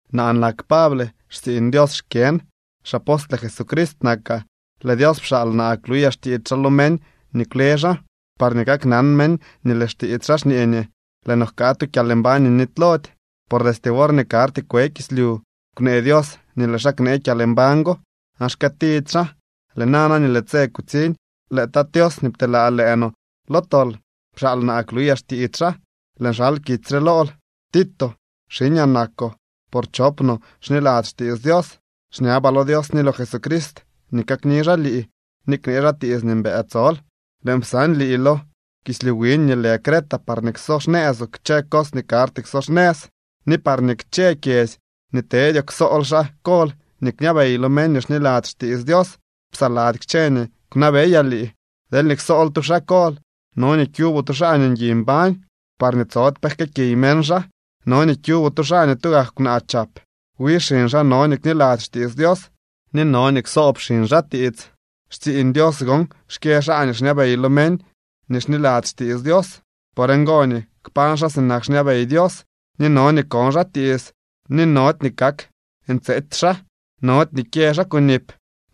Naa nak Pable, xtsiiñ Dios xkyën, xapostle Jesucrist nakaa. Lëë Dios pxaal naa kluyaa xtiits xaa lo meñ nii kwle xaa, parñee kaknan meñ nii lëë xtiits xaa xñee nii lëë no jka tu kyalmbañ nii nitylody. Por destye worñee karty kwe kislyu kwnee Dios nii lëë xaa knee kyalmbañ go aan xkëëtidy xaa. Lëë nana, nii lëë tse kutsiñ, lëë Tat Tios nii pteelaa lëë no lo tol pxaal naa kluyaa xtiits xaa. Lëën xal kitsy re lool, Tito. Xiñaa nakoo por chop no xniladzy xtiits Dios. Xñabaa lo Dios ni lo Jesucrist nii kakni xaa lii ni knee xaa tiits nii mbëë tsol. Lëën psan lii lo kislyu wiñ nii lëë Creta parñee kso xnëëzoo kchë cos nii karty kso xnëz, ni parñee kchë kyedzy nii tedyoo ksool xaa kol nii kñabey lo meñ nii xniladzy xtiits Dios, psaladzy kchë nii kwnabeyaa lii. Deelñee ksool tu xaa kol, no nii kyuboo tu xaa nii ngui mbañ, parñee tsody pe jkëëkiy meñ xaa. No nii kyuboo tu xaa nii tugak kwnaa chap, wi xiñ xaa no nii kniladzy xtiits Dios ni no nii ksoob xiñ xaa tiits. Xtsiiñ Dios gon xkyë xaa nii xñabey lo meñ nii xniladzy xtiits Dios. Por ngo nii kpañ xaa sinak xñabey Dios, ni no nii kon xaa tiits, ni nody nii kak ntseetsy xaa. Nody nii kyë xaa kunip,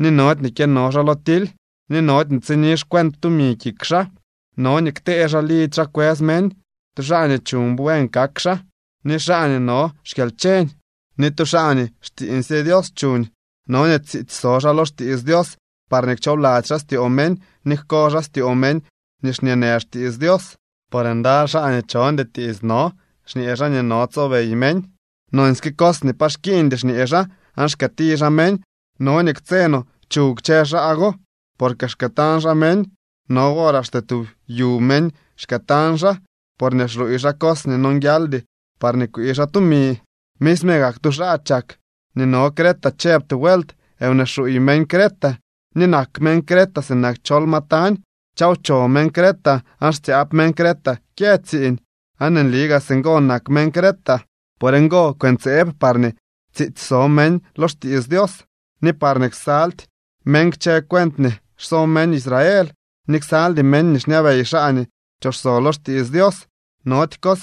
ni nody nii kyëno xaa lo tily, ni nody nii tsini xcuent tumi kik xaa. No nii ktee xaa lidzy xaa kwës meñ, tu xaa nii chuñ buen kak xaa, ni xaa nii no xkyalcheñ, ni tu xaa nii xtsiiñsye Dios chuñ. No nii tsiitsy so xaa lo xtiits Dios parñee kchoobladzy xaa styoo meñ ni jko xaa styoo meñ nii xñeenë xtiits Dios. Por ndaly xaa nii chondy tiits no. Xñee xaa nii no tsobey meñ. Nonsyke cos nii pa xkiiñdy xñee xaa aan xkëëti xaa meñ. No nii ktse no chuw kchë xaa go, porque xkëëtañ xaa meñ. No wor axte tub yu meñ xkëëtañ xaa, porñee xluuy xaa cos nii nonguialdy parñee kwii xaa tumi. Misme gak tu xaa chak nii no Creta chëb tu vuelt: “Wnee xuuy meñ Creta, ni nak meñ Creta sinak chol ma tañ, chawcho meñ Creta aan xtsyaab meñ Creta kyë tsiiñ.” Aan nli gaa singo nak meñ Creta. Por ngo, kwëntseeb parñee tsiitsy so meñ lo xtiits Dios, ni parñee ksaldy meñ kchë cuent nii xso meñ Israel, ni ksaldy meñ nii xñabey xaa nii pchooxso lo xtiits Dios. Nody cos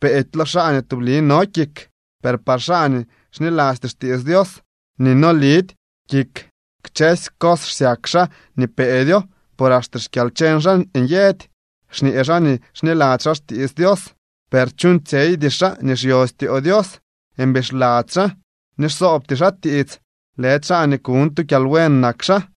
peedy lo xaa nii tubli no kik, per par xaa nii xnilasty xtiits Dios ni no lidy kik kchësy cos xsyak xaa nii peedyo, por axte xkyalcheñ xaa nyëdy. Xñee xaa nii xniladzy xaa xtiits Dios, per chuuñtsyeydy xaa nii xyo styoo Dios, mbixladzy xaa ni xsoobty xaa tiits, lëdy xaa nii kuñ tu kyalbuen nak xaa.